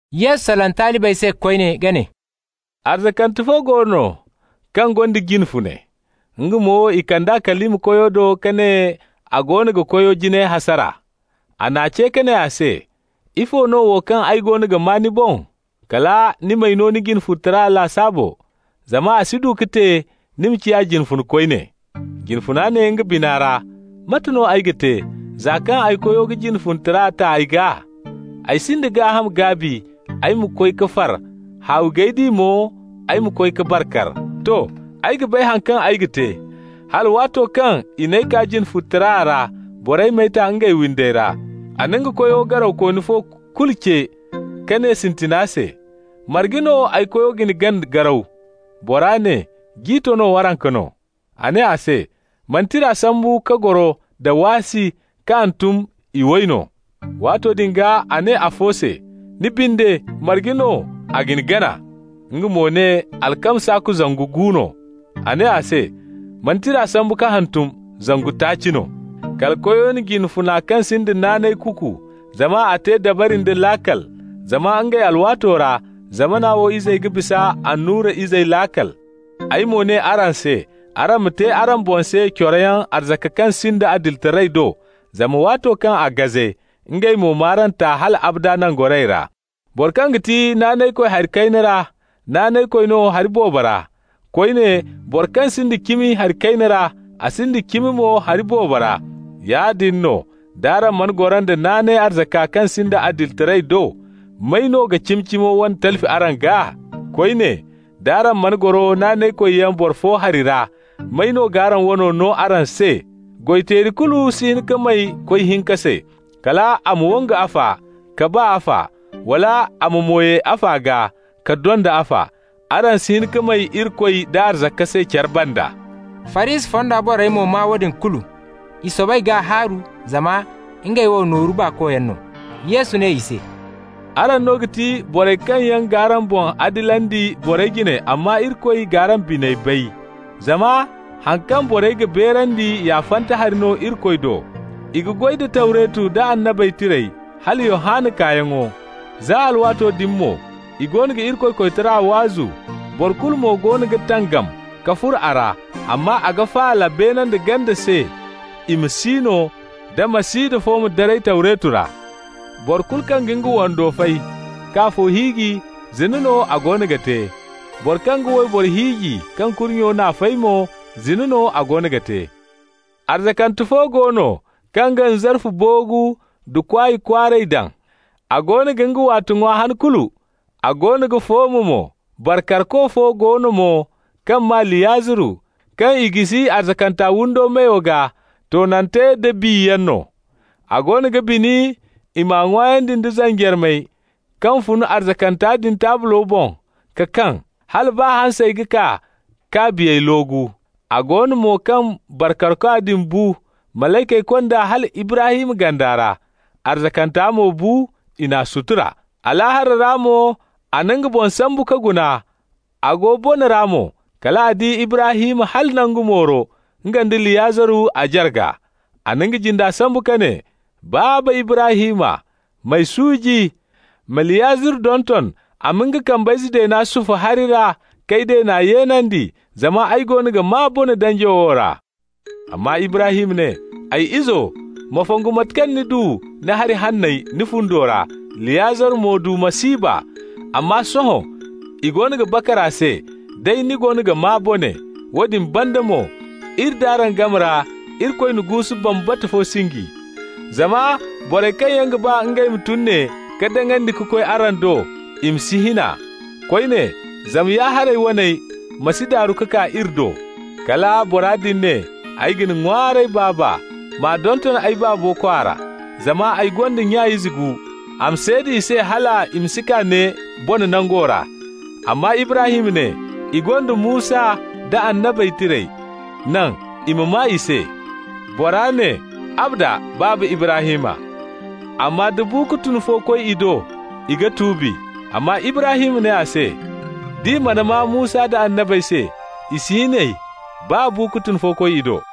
Yesu salaŋ talibey se koyne ka ne: «Arzakante fo go no kaŋ gonda jine fune. Nga mo, i kand'a kalima koyo do ka ne a goono ga koyo jinay hasara. A n'a ce ka ne a se: ‹Ifo no wo kaŋ ay goono ga maa ni boŋ? Kala ni m'ay no ni jine-funetara lasaabo, zama a si du ka te ni ma ciya jine fune koyne.› Jine funa ne nga bina ra: ‹Mate no ay ga te, za kaŋ ay koyo ga jine-funetara ta ay gaa? Ay sinda gaaham gaabi ay ma koy ka far, haawi g'ay di mo ay ma koy ka bar kar. To! Ay ga bay haŋ kaŋ ay ga te, hala waato kaŋ i n'ay kaa jine-funetara ra, borey m'ay ta ngey windey ra.› A na nga koyo garawkooni fo kulu ce ka ne sintina se: ‹Marge no ay koyo ga ni gana garaw?› Bora ne: ‹Ji tono waranka no.› A ne a se: ‹Ma ni tira sambu ka goro nda waasi ka hantum: iway no.› Waato din gaa a ne afo se: ‹Ni binde, marge no a ga ni gana?› Nga mo ne: ‹Alkama saaku zangu gu no.› A ne a se: ‹Ma ni tira sambu ka hantum: zangu taaci no.› Kala koyo na jine funa kaŋ sinda naanay kuuku, zama a te dabari nda laakal. Zama ngey alwaato ra, zamana wo izey ga bisa annura izey laakal. Ay mo ne araŋ se: araŋ ma te araŋ boŋ se coroyaŋ arzaka kaŋ sinda adilitaray do, zama waato kaŋ a gaze, ngey mo m'araŋ ta hal abada nangorayey ra. Boro kaŋ ga ti naanaykoy hari kayna ra, naanaykoy no hari boobo ra. Koyne, boro kaŋ sinda cimi hari kayna ra, a sinda cimi mo hari boobo ra. Yaadin no, d'araŋ mana goro nda naanay arzaka kaŋ sinda adilitaray do, may no ga cimi-cimo wane talfi araŋ gaa? Koyne, d'araŋ mana goro naanaykoyyaŋ boro fo hari ra, may no g'araŋ wano no araŋ se? Goy-teeri kulu si hin ka may koy hinka se. Kal a ma wangu afa, ka ba afa, wala a ma mo ye afa gaa, ka donda afa. Araŋ si hin ka may Irikoy da arzaka se care banda.» Farisi fonda borey mo maa woodin kulu. I soobay k'a haaru, zama ngey wo nooru baakoyaŋ no. Yesu ne i se: «Araŋ no ga ti borey kaŋ yaŋ g'araŋ boŋ adilandi borey jine amma Irikoy g'araŋ biney bay. Zama haŋ kaŋ borey ga beerandi ya fanta hari no Irikoy do. I ga goy da Tawretu nda Annabey Tirey hala Yohanna kaayaŋo. Za alwaato din mo i goono ga Irikoy koytara waazu, boro kulu mo goono ga tangam ka furo a ra. Amma a ga faala beene nda ganda se i ma si no, da masida fo ma daray Tawretu ra. Boro kulu kaŋ ga nga wando fay, k'afo hiiji, zina no a goono ga te. Boro kaŋ ga wayboro hiiji kaŋ kurnyo n'a fay mo, zina no a goono ga te. Arzakante fo go no, kaŋ ga nzarfu-boogu da kwaay kwaaray daŋ, a goono ga nga waate ŋwa han kulu, a goono ga fooma mo. Bar karko fo go no mo, kaŋ maa Liyaziru, kaŋ i jisi arzakanta windo meyo gaa, toonante nda biyaŋ no. A goono ga bini i m'a ŋwaayandi nda zanjarmey kaŋ fun arzakanta din taablo boŋ ka kaŋ. Hala baa hansey ga kaa k'a biyey loogu. A go no mo kaŋ bar karkwa din bu, malaykey kond'a hala Ibrahim ganda ra. Arzakanta mo bu, i n'a sutura. Alaahara ra mo a na nga boŋ sambu ka guna, a go bone ra mo. Kal a di Ibrahim hala nangu mooro, nga nda Liyaziru a jarga. A na nga jinde sambu ka ne: ‹Baaba Ibrahim, m'ay suuji! Ma Liyaziru donton, a ma nga kambayze deena sufu hari ra k'ay deena yeenandi, zama ay goono ga maa bone danjo wo ra.› Amma Ibrahim ne: ‹Ay izo, ma fongu mate kaŋ ni du ni hari hanney ni fundo ra, Liyaziru mo du masiiba. Amma sohõ i goono ga bakar a se, day ni goono ga maa bone. Woodin banda mo, iri nd'araŋ game ra Irikoy na guusu bambata fo sinji, zama borey kaŋ yaŋ ga ba ngey ma tun ne ka daŋandi ka koy araŋ do, i ma si hin a. Koyne, zama ya-haray waney ma si daaru ka kaa iri do.› Kala bora din ne: ‹Ay ga ni ŋwaaray, baaba, m'a donton ay baabo kwaara, zama ay gonda nya ize gu. A ma seeda i se hal i ma si kaa ne bone nango ra.› Amma Ibrahim ne: ‹I gonda Musa nda Annabey Tirey. Naŋ i ma maa i se.› Bora ne: ‹Abada, Baaba Ibrahim, amma da bu-ka-tun fo koy i do, i ga tuubi.› Amma Ibrahim ne a se: ‹D'i mana maa Musa nda annabey se, i si hin ey, baa bu-ka-tun fo koy i do.›»